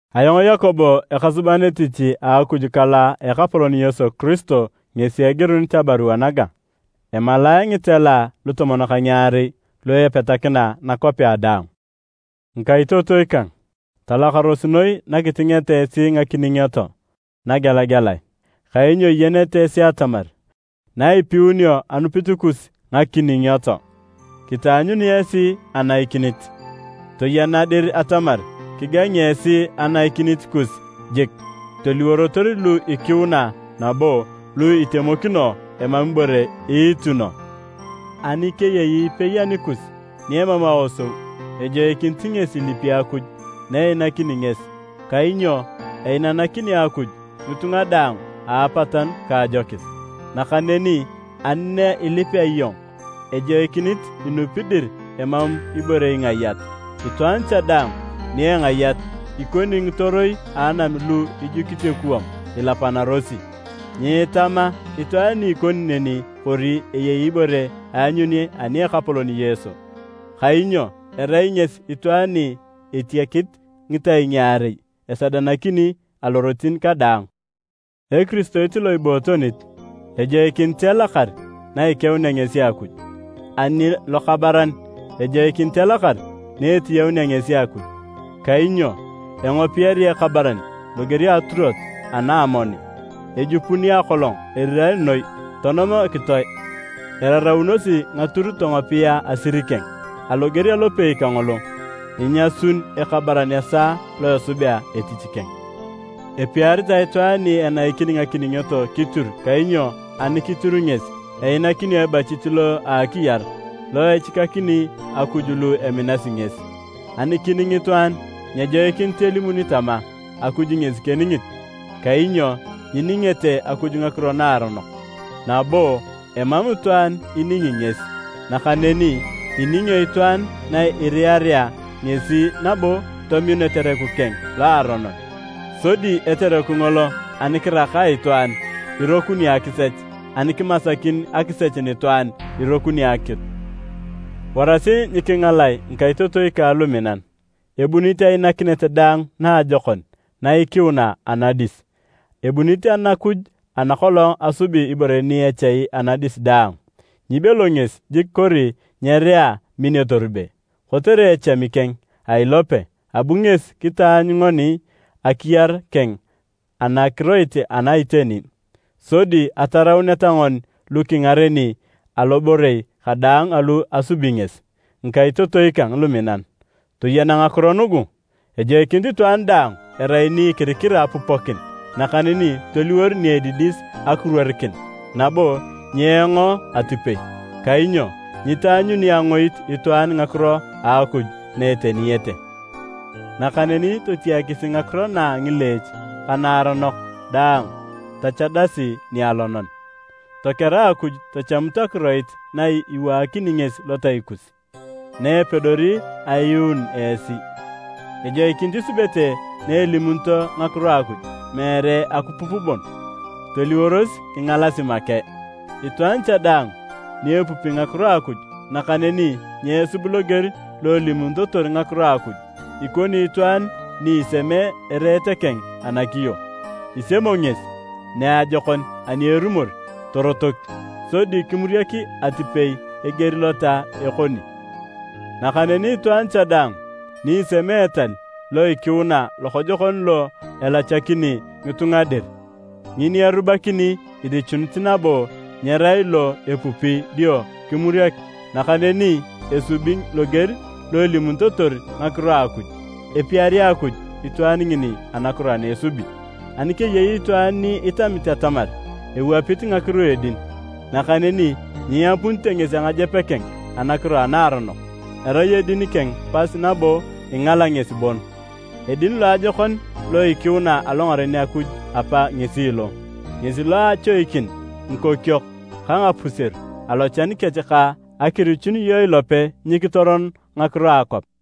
Ayong Yakobo ekasuban etich a Akuj ka lo a Ekapolon Yesu Kiristo ngesi egirunit abarua naga. Emalae ngitela lutomon ka ngiarei lu epetakina nakwapea daang. Ngikaitotoi kang, talakaros noi na kitingeta esi ngakiningioto nagelagelae, kainyo iyenete esi atamar na ipiunio anupit kus ngakiningioto, kitaanyuni esi anaikinit. Toyena dir atamar kigangi esi anaikinit kus jik, toliworotor lu ikiuna nabo lu itemokino, emam ibore iituno. Ani keyei ipei anikus ni emam aosou, ejoikinit ngesi ilipi Akuj na einakini ngesi, kainyo einanakini Akuj ngitunga daang a apatanu ka ajokis. Nakaneni ani na ilipea iyong, ejoikinit inupi dir emam ibore ingayat. Itwaan cha daang ni engayat, ikoni ngitoroi a anam lu ijukit ekuwam ilapanarosi. Nyeetama itwaan ni ikoni neni kori eyei ibore aanyuni ani a Ekapolon Yesu, kainyo erai ngesi itwaan ni etiakit ngitai ngaarei, esadanakini alorotin kadaang. Ekiristoit lo ibootonit, ejoikinit elakar na ikeunea ngesi Akuj, ani lokabaran ejoikinit elakar na etiyaunea ngesi Akuj. Kainyo engopiyari ekabaran loger a aturot ana a amoni. Ejupuni akolong erirae noi tonom ekitoe, eraraunosi ngatur tongopia asir keng. Aloger alopei kangolo, inyasun ekabaran esaa lo esubea etich keng. Epiaritae itwaan ni enaikini ngakiningioto kitiru kainyo ani kitiru ngesi einakinio ebachit lo akiyar, lo echikakini Akuj lu eminasi ngesi. Ani kining itwaan, nyejoikinit elimuni tama, “Akuj ngesi keningit.” Kainyo nyiningete Akuj ngakiro naaronok, nabo emam itwaan iningi ngesi. Nakaneni iningio itwaan na iriarea ngesi nabo tominu etereku keng loaronon. Sodi etereku ngolo ani kiraka itwaan, irokuni akisech, ani kemasikin akisech nitwaan, irokuni akitu. Warasi nyikingalae ngikaitotoi kang luminan! Ebunit ainakinet daang naajokon na ikiuna anadis, ebunit Anakuj ana kolong asubuni ibore ni echai anadis daang. Nyibelo ngesi jik kori nyerea min etorube. Kotere echami keng a ilope, abu ngesi kitaanyu ngoni akiyar keng anakiroit ana iteni, sodi atarauneta ngoni lu kingareni aloborei kadaang alu asubi ngesi. Ngikaitotoi kang luminan, toyena ngakiro nugu! Ejoikinit itwaan daang erai ni ikirikira apupokin, nakaneni toliwor ni edidis akiruorikin nabo nyeengo atipei. Kainyo nyitaanyuni angoit itwaan ngakiro a Akuj na eteniyete. Nakaneni totiakisi ngakiro na a ngileech ka naaronok daang tachadasi nialonan. Tokera Akuj tachamut akiroit na iwaakini ngesi lotai kus, na epedori ayuun esi. Ejoikinit isubete na elimunito ngakiro a Akuj, meere akipup bon, toliworos ingalasi make. Itwaan cha daang ni epupi ngakiro a Akuj nakaneni nyeesub loger lo elimunitotor ngakiro a Akuj, ikoni itwaan ni isemee ereet keng anakiyo. Isemo ngesi niajokon ani erumor torotok, sodi kimuriak atipei eger lota ekoni. Nakaneni itwaan cha daang ni isemee etal lo ikiuna lokojokon lo elachanakini ngitunga dir, ngini erubakini irichunit nabo nyerai lo epupi dio kimuriak, nakaneni esubi loger lo elimunitotor ngakiro a Akuj, epiari Akuj itwaan ngini anakiro ana esubi. Ani keyei itwaan ni itamit atamar ewapit ngakiro a edin, nakaneni nyiiyapunite ngesi angajep keng anakiro a naaronok, erai edin keng pas nabo ingala ngesi bon. Edin loajokon lo ikiuna alongaren Akuj Apa ngesi lo, ngesi lo a achoikin ngikokiok ka ngapuseru alochan kech ka akirichun iyong ilope nyikitoron ngakiro a akwap.